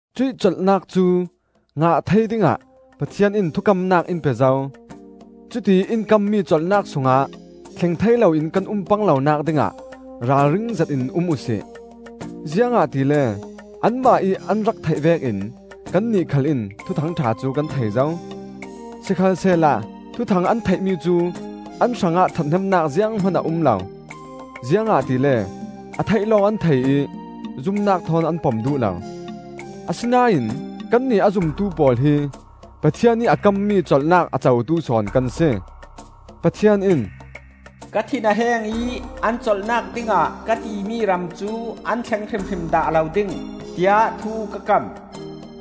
Cuih colhnak cu ngah thei dingah Pathian in thukamnak in pe zo. Cutiih in kammi colhnak sungah thleng thei loin kan um pang lonak dingah ralring zetin um uhsi. Ziangahtile anmah ih an rak theih vekin kannih khal in Thuthang ṭha cu kan thei zo. Sikhalsehla Thuthang an theihmi cu an hrangah ṭhathnemnak zianghman a um lo, ziangahtile a theih lawng an thei ih zumnak thawn an pom duh lo. Asinain kannih a zumtu pawl hi Pathian ih a kammi colhnak a cotu sawn kan si. Pathian in, “Ka thin a heng ih, ‘An colhnak dingah ka timi ram cu an thleng hrimhrim dah lo ding,’ tiah thu ka kam,”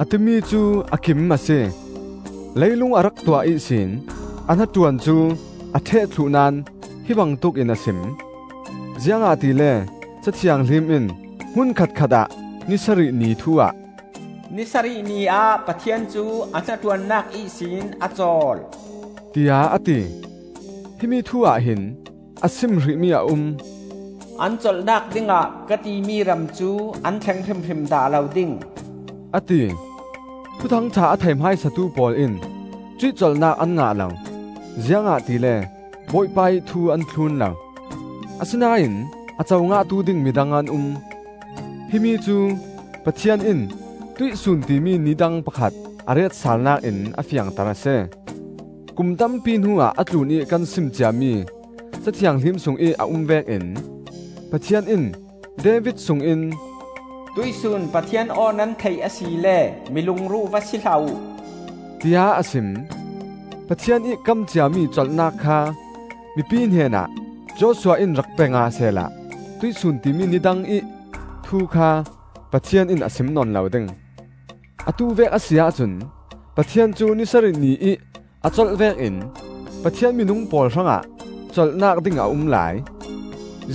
a timi cu a kim a si. Leilung a rak tuah ihsin a hnaṭuan cu a ṭheh thluh naón hi bangtuk in a sim. Ziangahtile Ca Thianghlim in hmunkhat khatah ni sarih ni thu ah, “Ni sarih ni ah Pathian cu a hnaṭuannak ihsin a cawl,” tiah a ti. Himi thu ahhin a sim hrihmi a um, “An colhnak dingah ka timi ram cu an thleng hrimhrim dah lo ding,” a ti. Thuthang ṭha a thei hmaisatu pawl in cuih colhnak an ngah lo, ziangahtile Bawipa ih thu an thlun lo. Asinain a co ngahtu ding midang an um. Himi cu Pathian in “Tuihsun,” timi ni dang pakhat a retsalnak in a fiangter a si. Kum tampi hnuah a tlunih kan sim ciami Ca Thianghlim sungih a um vekin Pathian in David sungin, “Tuihsun Pathian aw nan theih asile mi lungruh va si hlah uh,” tiah a sim. Pathian ih kam ciami colhnak kha mipi hnenah Joshua in rak pe ngah sehla “Tuihsun,” timi ni dangih thu kha Pathian in a sim nawn lo ding. Atu vek a si ahcun Pathian cu ni sarih ni ih a colh vekin Pathian minung pawl hrangah colhnak ding a um lai.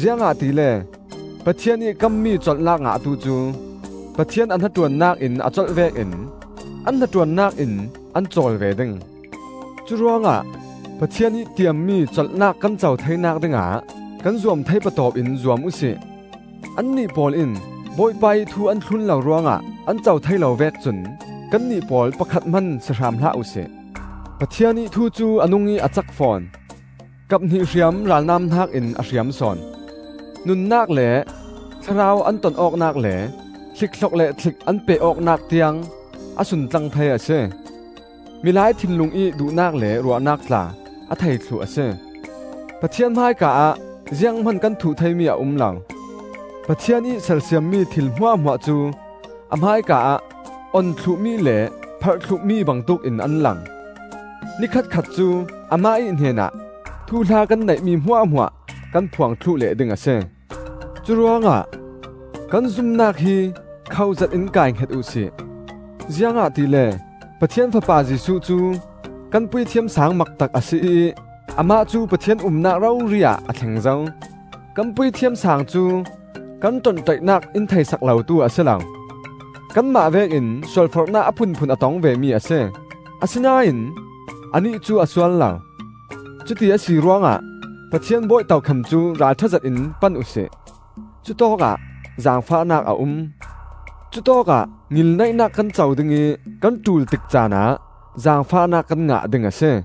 Ziangahtile Pathian ih kammi colhnak ngahtu cu, Pathian a hnaṭuannak in a colh vekin, an hnaṭuannak in an cawl ve ding. Curuangah Pathian ih tiammi colhnak kan co theinak dingah kan zuam thei patawp in zuam uhsi. Annih pawl in Bawipa ih thu an thlun lo ruangah an co thei lo vek cun kannih pawl pakhat hman si hram hlah uhsi. Pathian ih thu cu a nungih a cak fawn. Kap hnih hriam ralnam hnakin a hriam sawn. Nunnak le thlarau an ton awknak le hlikhlok le thlik an peh awknak tiang a suntlang thei a si. Milai thinlung ih duhnak le ruahnak tla a thei thluh a si. Pathian hmaika ah zianghman kan thuh theimi a um lo. Pathian ih sersiammi thil hmuahhmuah cu a hmaika ah on thluhmi le pharh thluhmi bangtuk in an lang. Ni khatkhat cu amah ih hnenah thuhla kan neihmi hmuahhmuah kan phuang thluh leh ding a si. Curuangah kan zumnak hi khoh zetin kaihnget uh si. Ziangahtile Pathian Fapa Jesuh cu kan Puithiam Saang maktak a si ih amah cu Pathian umnak rori ah a thleng zo. Kan Puithiam Saang cu kan ṭonṭaihnak in theihsak lotu a si lo. Kanmah vekin sualforhnak a phunphun a tong vemi a si; asinain anih cu a sual lo. Cuti a si ruangah Pathian bawi tokham cu ralṭha zetin pan uhsi; cutawkah zaangfahnak a um. Cutawkah ngilneihnak kan co ding ih kan ṭul tik caanah zaangfahnak kan ngah ding a si.